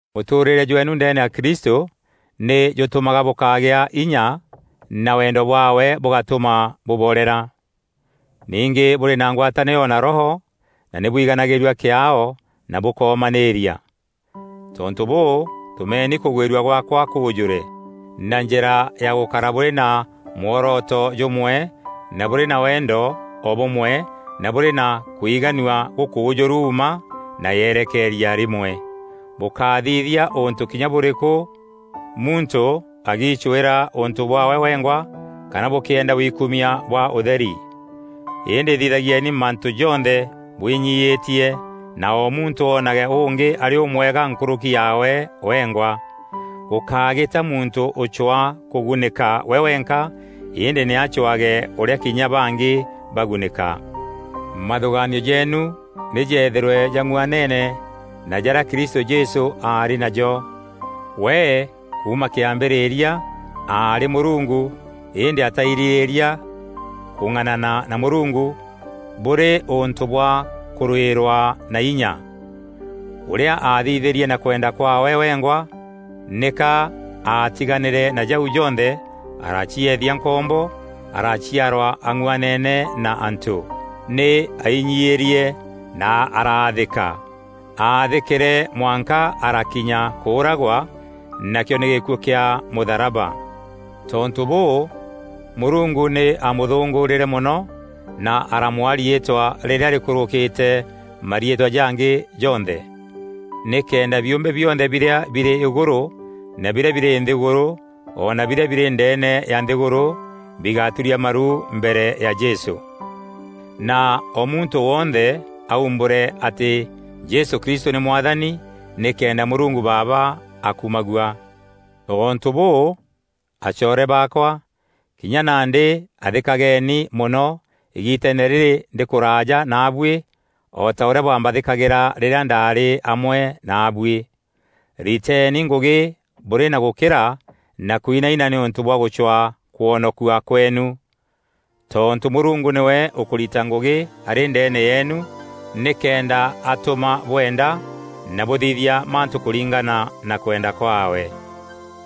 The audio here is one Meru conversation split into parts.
Mûtûûrîre jweenu ndeene ya Kristû nî jûtûmaga bûkagîa inya na wendo bwaawe bûgatûma bûborera. Ningî bûrî na ngwatanîro na Roho na nî bwiganagîîrua kîaao na bûkomanîîria. Tontû bûû tûmeni kûgwîrua gwaakwa kûûjûre, na njîra ya gûkara bûrî na mworoto jûmwe na bûrî na wendo o bûmwe na bûrî na kwiganua gûkûûjûru mma na yerekeeria rîmwe. Bûkáthithia ûntû kinya bûrîkû muntû agiicwîra ûntû bwaawe wengwa kana bûkîenda wikumia bwa ûtheri. Îndî thithagieni mantû jonthe bwinyiîtie na o muntû oonage ûngî arî ûmwega nkûrûki yaawe wengwa. Gûkágîta muntû ûcwaa kûgunîka we wenka îndî nî acwaage ûrîa kinya bangî bagunîka. Mathûgaanio jeenu nî jeethîrwe jang'uanene na jarîa Kristû Jesû aarî najo: We, kuuma kambîrîria, aarî Mûrungu, îndî atairîrîîria kûng'anana na Mûrungu, bûrî ûntû bwa kûrûîrwaa na inya. Ûrîa aathithîrie na kwenda kwaawe wengwa, nîka aatiganîre na jau jonthe, aracieethia nkombo, araciarwa ang'uanene na antû. Nî ainyiîrie na araathîka aathîkîre mwanka arakinya kûûragwa, nakîo nî gîkuû kîa mûtharaba. Tontû bûû, Mûrungu nî amûthûngûûrîre mono, na aramwaa riîtwa rîrîa rîkûrûkîte mariîtwa jangî jonthe. Nîkenda biûmbe bionthe birîa birî îgûrû na birîa birî nthîgûrû ona birîa birî ndeene ya nthîgûrû, bigaturia maru mbere ya Jesû, na o muntû wonthe aumbûre atî Jesû Kristû nî Mwathani, nîkenda Mûrungu Baaba akumagua. Tontû bûû, acoore baakwa, kinya nandî athîkageni mono îgiiteene rîrî ndî kûraaja naabuî o ta ûrîa bwambathîkagîra rîrîa ndaarî amwe naabuî. Riteeni ngûgî bûrî na gûkîra na kwinaina nîûntû bwa gûcwaa kwonokua kweenu. Tontû Mûrungu nîwe ûkûrita ngûgî arî ndeene yeenu nîkenda atûma bwenda na bûthithia mantû kûringana na kwenda kwaawe.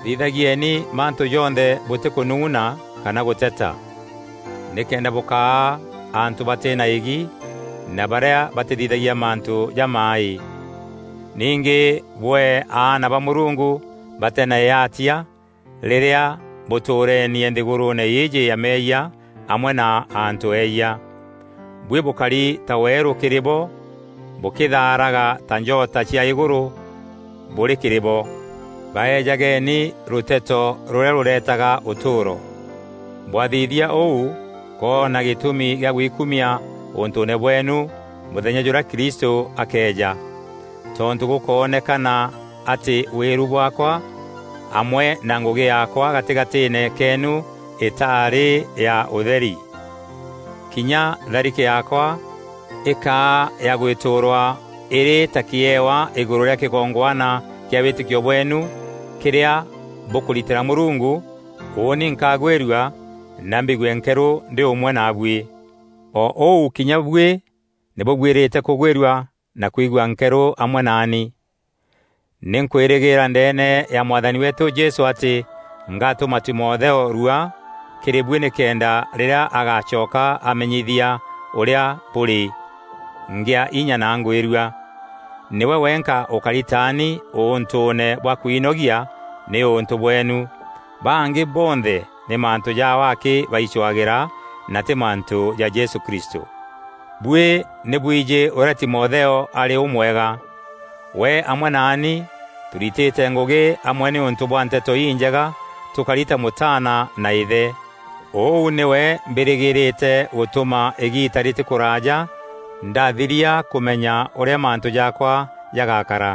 Thithagieni mantû jonthe bûtîkûnung'una kana gûteta, nîkenda bûkaa antû batî na îgi na barîa batîthithagia mantû jamaaî. Ningî bwee aana ba Mûrungu batî na îatia rîrîa bûtûûrenie nthîgûrûûne îîjî ya meeyia amwe na antû eeyia. Buî bûkari ta weerû kîrî bo bûkîthaaraga ta njota cia îgûrû bûrî kîrî bo. Baeejageni rûteto rûrîa rûreetaga ûtûûro. Bwathithia ûu, nkoona gîtûmi kîa gwikumia ûntûûne bweenu mûthenya jûrîa Kristû akeeja. Tontû gûkoonekana atî wîru bwaakwa amwe na ngûgî yaakwa gatîgatîîne keenu îtaarî ya ûtheri. Kinya tharike yaakwa îkaa ya gwîtûûrwa îrî ta kîewa îgûrû rîa kîgongwana kîa wîtîkio bweenu kîrîa bûkûritîra Mûrungu, ûûni nkagwîrua na mbigue nkerû ndî ûmwe naabuî. O ûu kinya buî nî bûbuîrîte kûgwîrua na kwigua nkerû amwe naani. Nî nkwîrîgîîra ndeene ya Mwathani weetû Jesû atî ngatûma Timotheo rua kîrî buî nîkenda rîrîa agacoka amenyithia ûrîa bûrî, ngîa inya na ngwîrua. Nîwe wenka ûkari taani ûntûûne bwa kwinogia nîûntû bweenu. Bangî bonthe nî mantû jaao akî baicwagîra, na tî mantû ja Jesû Kristû. Buî nî bwijî ûrîa Timotheo arî ûmwega. We amwe naani tûritîte ngûgî amwe nîûntû bwa Nteto Injega tûkari ta mûtaana na îthe. Ûu nîwe mbîrîgîîrîte gûtûma îgiita rîtî kûraaja ndathiria kûmenya ûrîa mantû jaakwa jagakara.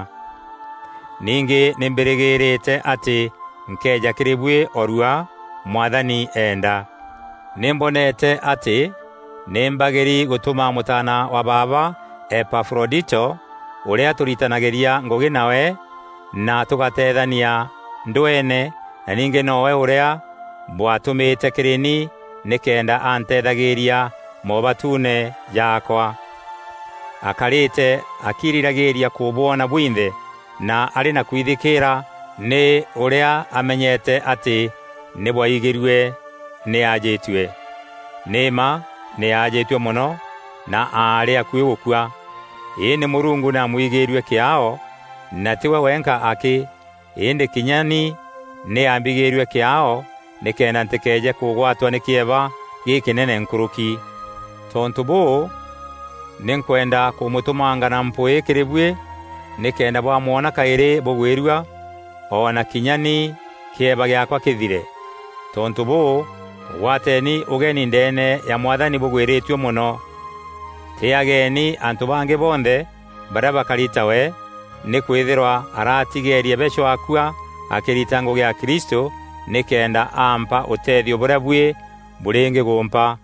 Ningî nî mbîrîgîîrîte atî nkeeja kîrî buî o rua, Mwathani eenda. Nî mboneete atî nî mbagîri gûtûma mûtaana wa baaba Epafrodito, ûrîa tûritanagîria ngûgî nawe na tûgateethania ndweene na ningî nowe ûrîa bwatûmîte kîrî ni nîkenda anteethagîîria moobatuune jaakwa. Akarîte akiirîragîîria kûbwona bwinthe na arî na kwithikîîra nî ûrîa amenyete atî nî bwaigîrue nî ajîtue. Nî mma nî aajîtue mono na aarî akuî gûkua. Îndî Mûrungu nî aamwigîîrue kîaao, na tî we wenka akî, îndî kinya ni nî aambigîîrue kîaao nîkenda ntîkeeje kûgwatwa nî kîeba gîkînene nkûrûki. Tontû bûû, nî nkwenda kûmûtûmanga na mpwîî kîrî buî, nîkenda bwamwona kaîrî bûgwîrua, o na kinya ni kîeba gîaakwa kîthire. Tontû bûû mûgwateeni ûgeni ndeene ya Mwathani bûgwîrîtue mono. Tîîageeni antû bangî bonthe barîa bakari tawe, nîkwîthîrwa aratigeerie beco akua akîrita ngûgî ya Kristû nîkenda aampa ûtethio bûrîa buî bûrîngîgûmpa.